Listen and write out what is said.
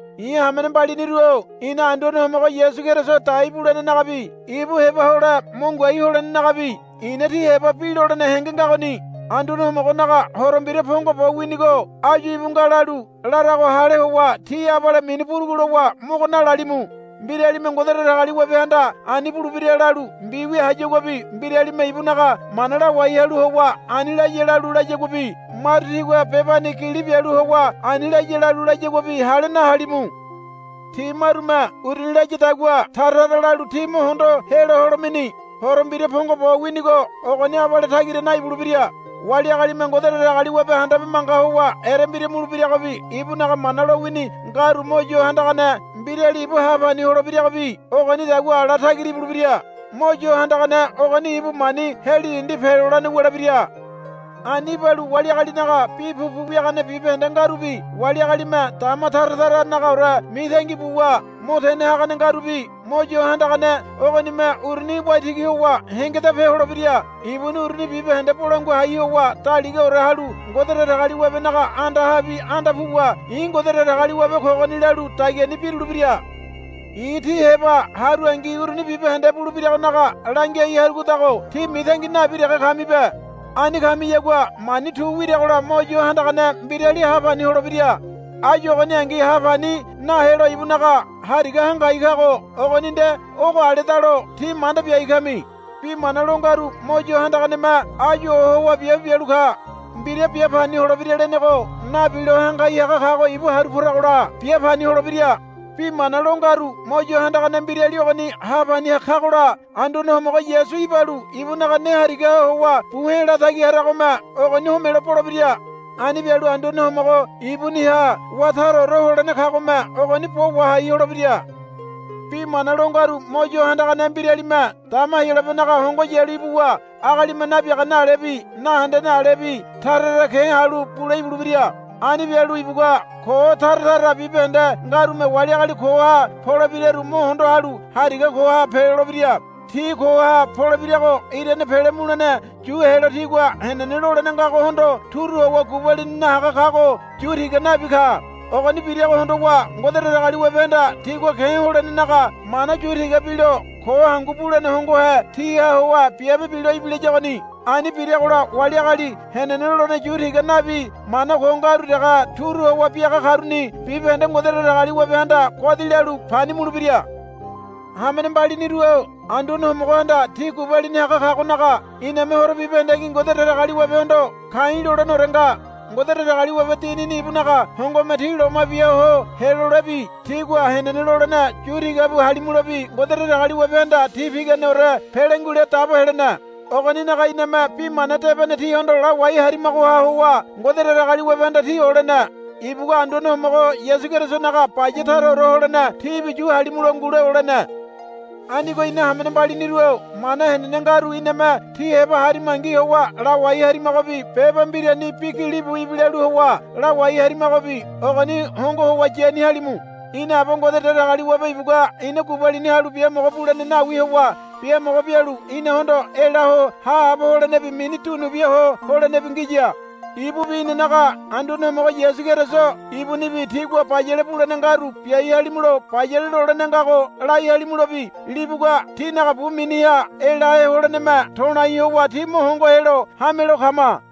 I̱ hamene mbaliniru-o ina Anduane Homogo Yasu Keriso dai bulenenagabi ibu heba hole mo ngoai holenenagabi i̱na tí heba bi lolene henge ngagoni. Anduane Homogonaga Horo Mbira pongo bo winigo áyu íbu nga lalu larago hale howa tí abale mini burugu lowa mogo nalalimu. Mbiralime Ngode Datagaliwabehanda ani bulebira lalu mbiwia hayaguabi mbiralime ibunaga mana lawai halu howa ani laya lalu layaguabi maru tigua bebani gili bialu howa ani laya lalu layaguabi hale nahalimu. Ti marume uruni layadagua tara tara lalu tí mo hondo helo holemeni. Horo Mbira pongo bo winigo ogoni abale tagira naibulebira. Wali agalime Ngode Datagaliwabe handabe manga howa erembira mulebiragobi ibunaga mana lowini ngaru Mo Yo Handagane Mbirali ibu hapani holebiragobi ogonidagua ala tagira ibulebira. Mo Yo Handagane ogoni ibu mani heli dindi pelolene wulebira. Ani ibalu wali agalinaga bi pupu wiagane bibahende ngarubi wali agalime dama tara taranagaore mitangi buwa mo tene hagane ngarubi Mo Yo Handagane ogonime uruni waitigi howa hengedape holebira. Ibuni uruni bibahende bolangua hai howa daligaore halu Ngode Datagaliwabenaga andahabi anda puwa, I̱ Ngode Datagaliwabe kogoni, lalu dagiani birulebira. I̱ tí heba harungi uruni bibahende bulebiragonaga langiai harugodago tí mitangi nabi dege kamibe. Ani kamiyagua mani tu wiragola Mo Yo Handagane Mbirali ha pani holebira. Áyu ogoningi ha pani nahelo ibunaga hariga hangai kago ogoni nde ogo aledalo tí manda biai kami. Bi mana lo ngaru Mo Yo Handaganeme áyu ohowa biabe bialu ka. Mbira bia pani holebira lenego nabilo hangai haga kago ibu haru poragola bia pani holebira. Bi mana lo ngaru Mo Yo Handagane Mbirali ogoni ha pani kagola Anduane Homogo Yasu ibalu ibunaga ne harigaha howa bu he̱ latagi haragome ogoni homelo bolebira. Ani bialu Anduane Homogo ibuniha wá taraore holene kagome ogoni bo wahai holebira. Bi mana lo ngaru Mo Yo Handagane Mbiralime dama Heyolabenaga hongo yalu ibuwa agalime nabiagane alebi nahendene alebi tara tara ke̱ halu bule ibulebira. Ani bialu ibugua ko tara tara bibahende ngarume wali agali koha polebiraru mo hondo halu hariga koha pelolebira. Ti koha polebirago irane pele mulene yu helo tigua henene lolene ngagohondo turu howa gubalini nahaga kago yu tiga nabi ka. Ogoni birago hondowa Ngode Datagaliwabehanda tigua ke̱ holenenaga mana yu tiga bilo ko hangu bulene hongohe tiha howa biabe bilo ibilayagoni. Ani biragola wali agali henene lolene yu tiga nabi mana ko ngaru dege turu howa biaga karuni bibahende Ngode Datagaliwabehanda godi lalu pani mulebira. Hamene mbaliniru-o Anduane Homogohanda tí gubalini haga kagonaga iname horo bibahendengi Ngode Datagaliwabehondo ka̱i̱ loleneore nga. Ngode Datagaliwabe Dinini ibunaga hongome tí loma bia ho helolebi tígua henene lolene yu tiga bu halimulobi Ngode Datagaliwabehanda tí piganeore pele ngule dabo helene. Ogoninaga iname Bi Mana Debene tíhondo lawai harimagoha howa Ngode Datagaliwabehanda tí olene. Ibugua Anduane Homogo Yasu Kerisonaga baya taraore holene tíbi yu halimulo ngule olene. Anigo ina hamene mbaliniru-o mana henene ngaru iname tí heba harimangi howa lawai harimagobi beba mbirani bi gilibu ibilalu howa lawai harimagobi ogoni hongo howa yani halimu. Ina Aba Ngode Datagaliwabe ibugua ina gubalini halu biamogo bulene nawi howa biamogo bialu inahondo ela ho haabo holenebi mini dunu biaho holenebi ngiya. Ibubi inanaga Anduane Homogo Yasu Keriso ibunibi tígua bayale bulene ngaru biai halimulo bayale lolene ngago lai halimulobi libugua tínaga bu miniha elahe holeneme to̱lai howa tí mo hongo helo hamelo kama.